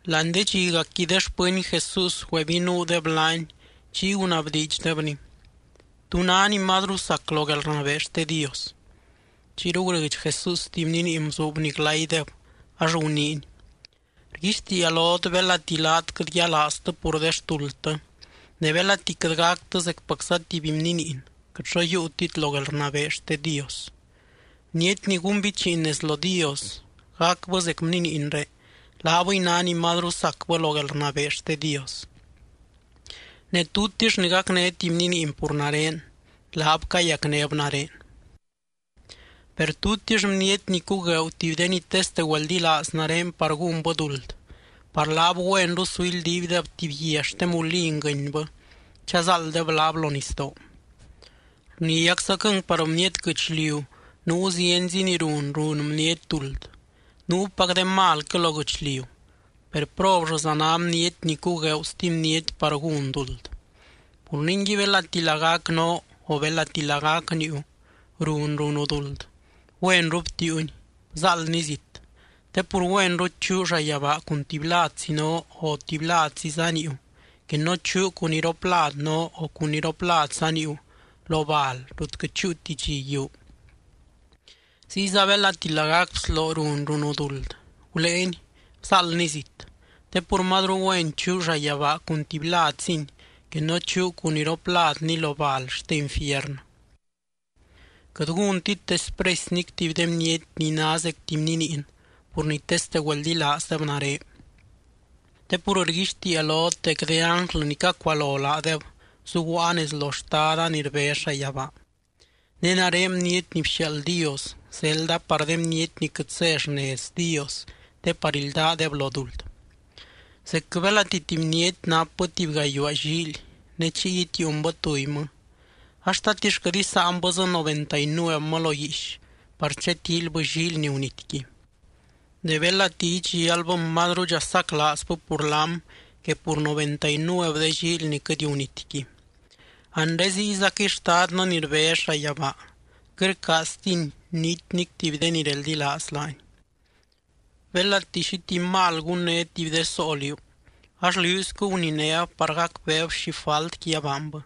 Láani de dxiacqui de xpɨny Jesús güebinuudeb laany, chiy gunabdiidxdebny: —¿Tú ná ni mazru sac lo guelrnabee xte Dios? Chiyru gurɨdx Jesús tuby bniniin bzuubny glaydeb ax guniiny: —Rguixtiia lot belati laat quɨt yialaaztɨ pur de xtuldtɨ ne belati quɨt gactɨ zecpacza tuby bniniin, quɨt xo yiiutit lo guelrnabee xte Dios. Bniety ni gúnbichiin nez lo Dios, gacbɨ zec bniniinré, laabɨy ná ni mazru sacbɨ lo guelrnabee xte Dios. Ne tutix ni gacné tuby bniniin pur nare, laab cayacnéb nare. ’Per tutix bniety ni cugueeu tuby de ni teste güeldilaaz nare par gúnbɨ duld, par laab güenru su ildiibdeb tuby guia xte mulin guɨnybɨ chazáalddeb laab lo nisdoo. ¡Rniaczaquɨng par bniety guɨchliu nuu zienzi ni run, run bniety duld! Nuupac de malquɨ lo guɨchliu, ¡per probllɨza ná bniety ni cugueeu stuby bniety par gún duld! ’Pur ningui belati lagac noo, o belati lagac niiu run, runu duld, güenru btiiuni, bzáaldni zit. Te pur güenru chuu llayabaa cun tuby ladzi noo, o tuby ladziza niiu que no chuu cun iroplad noo, o cun iropladza niiu lo bal ni quɨt chúuti dxi yiuu. Ziyza belati lagac bsloo run runu duld, guléeni bzáaldni zit. Te pur mazru güen chuu llayabaa cun tuby ladzini, que no chuu cun iropladni lo bal xte infiernɨ. ’Quɨt gúntit despresy nic tuby de bniety ni ná zec tuby bniniin pur ni teste güeldilaazdeb nare, te pur rguixtiia lot dec de ánglɨ ni cacualo laadeb zuguaa nez lo Xtada ni rbez llayabaa. Ne nare Bniety ni bxiaald Dios zelda par de bniety ni quɨt zé xnez Dios te par ildaadeb lo duld. ’Zecquɨ belati tuby bniety napbɨ tuby gayuaa llíily ne chiy itiiunbɨ tubymɨ ax, ¿tatix quɨt isáanbɨ dzɨ noventa y nuevmɨ lo guiix par chatíilybɨ llíily ni gunityqui? Ne belati idxialbɨm, mazrudxa saclaazbɨ pur laam que pur noventa y nuev de llíily ni quɨt gunityqui. Anre ziyzaquɨy Xtadtɨ ni rbez llayabaa quɨt rcaaztiny niti nic tuby de ni reldilaaz laany. ’Belati xi tuby mal gunné tuby de soo liú, ax liúiscu guninéb par gacbeeb xi faltqui abaanbɨ,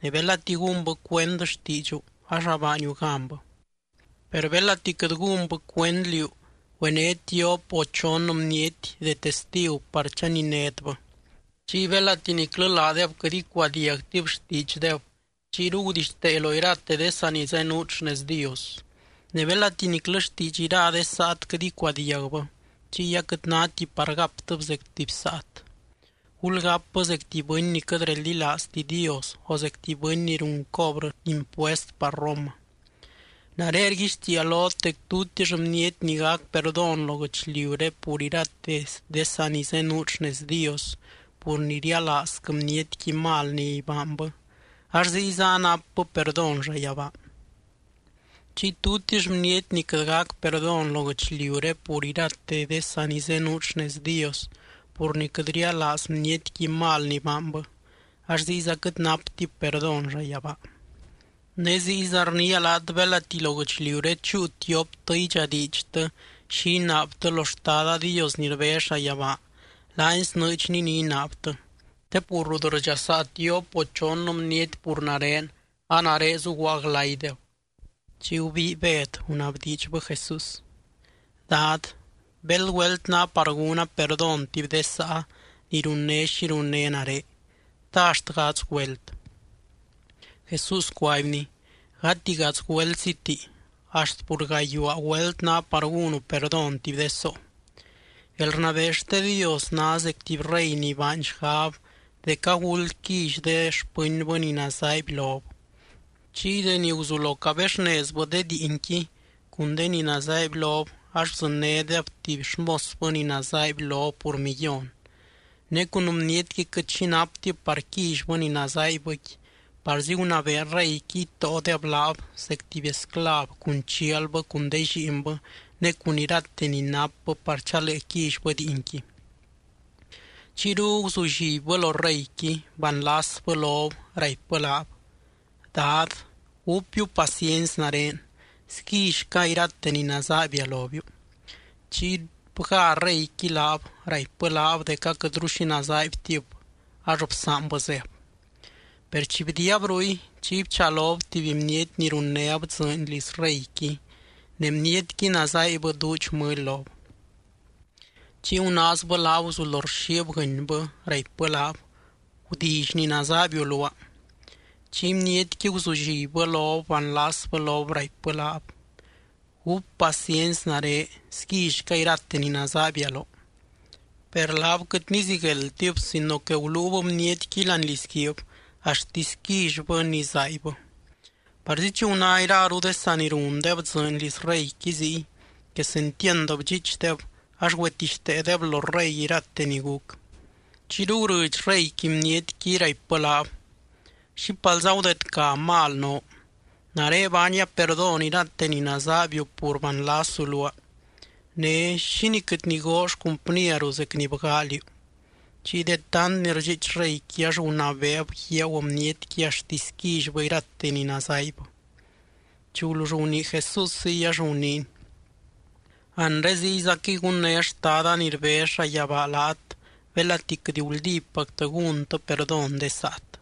ne belati gúnbɨ cuend xtiidxu ax abaaniu ganbɨ. Per belati quɨt gúnbɨ cuend liú, güené tiop o chon bniety de testigu par chaninétbɨ. Chiy belati niclɨ laadeb quɨt icuadiagtib xtiidxdeb, chiyru gudixtee lo irate de sanizenuut xnez Dios. Ne belati niclɨ xtiidx ira de saat quɨt icuadiagbɨ, chiy aquɨt náti par gaptɨb zec tuby saat. Gulgápbɨ zec tuby bɨny ni quɨt reldilaazti Dios, o zec tuby bɨny ni run cobrɨ impuest par Roma. ’Nare rguixtiia lot dec tutix bniety ni gac perdón lo guɨchliuré pur irate de sanizenuut xnez Dios pur ni rialaazquɨ bnietqui mal ni baanbɨ, ax ziyza anapbɨ perdón llayabaa. Chiy tutix bniety ni quɨt gac perdón lo guɨchliuré pur irate de sanizenuut xnez Dios pur ni quɨt rialaaz bnietqui mal ni baanbɨ, ax ziyza quɨt naptib perdón llayabaa. ’Ne ziyza rniia laat belati lo guɨchliuré chúu tioptɨ idxadiidxtɨ xi inaabtɨ lo Xtada Dios ni rbez llayabaa, laany snɨɨdxny ni inaabtɨ. Te pur rut rdxasaa tiop o chon bniety pur nare, a nare zuguaa glaydeb. Chiy gubii Bed gunabdiidxbɨ Jesús: —Dad, ¿béld güelt ná par gúna perdón tuby de sáa ni runné xi runné nare? ¿Ta axt gadz güelt? Jesús cuaibny: —Gati gadz güeltsiti, axt pur gayuaa güelt ná par gúnu perdón tuby de soo. ’Guelrnabee xte Dios ná zec tuby rey ni baany xgab dec aguld quilly de xpɨnbɨ ni nazaaiby lob. Chiy deni guzulo cabexnezbɨ de diinqui cun de ni nazaaiby lob, ax bdzɨnnédeb tuby xmosbɨ ni nazaaiby lob pur millón. Ne cun bnietqui quɨt xi naptib par quillybɨ ni nazaaibbɨqui, parzi gunabee reyqui itóodeb laab zec tuby esclav cun chialbɨ cun de lliinbɨ ne cun irate ni napbɨ par chalee quillybɨ diinqui. Chiyru guzullibbɨ lo reyqui, banlasbɨ lob, raipbɨ laab: “Dad, gúpbiu paciency nare, sguillyca irate ni nazaaibia lobiu.” Chiy bgá reyqui laab, raipbɨ laab dec aquɨtru xi nazaaibtib, ax bsaanbɨ zéb. ’Per chi bdiiab ruy, chiy bchalob tuby bniety ni runnéb dzɨɨny liz reyqui ne bnietqui nazaaibbɨ duudx mɨly lob. Chiy gunaazbɨ laab guzulo rxiib guɨnybɨ, raipbɨ laab: “¡Gudilly ni nazaaibiu luaa!” Chiy bnietqui guzullibbɨ lob, banlasbɨ lob, raipbɨ laab: “Gúp paciency nare, sguillyca irate ni nazaaibia loo.” Per laab quɨt nizigueldtib sino que guluub bnietqui láani lizguiib axtisy quillybɨ ni zaaibbɨ. Parzi chi guná iraru de saa ni rundeb dzɨɨny liz reyqui ziy, quesentiand bdxiichdeb ax güetixteedeb lo rey irate ni guc. Chiyru gurɨdx reyqui bnietqui, raipbɨ laab: “¡Xípalza gudedca mal noo! Nare baania perdón irate ni nazaaibiu pur banlasu luaa. Ne, ¿xínii quɨt nigoo xcumpnieru zec ni bgaa liú?” Chiy de tant ni rdxiich reyqui, ax gunabeeb guiagu bnietqui axtisy quillybɨ irate ni nazaaibbɨ. Chi gulull gunii Jesús ziy ax guniiny: —Anre ziyzaquɨy gunné Xtada ni rbez llayabaa laat belati quɨt guldípactɨ gúntɨ perdón de saat.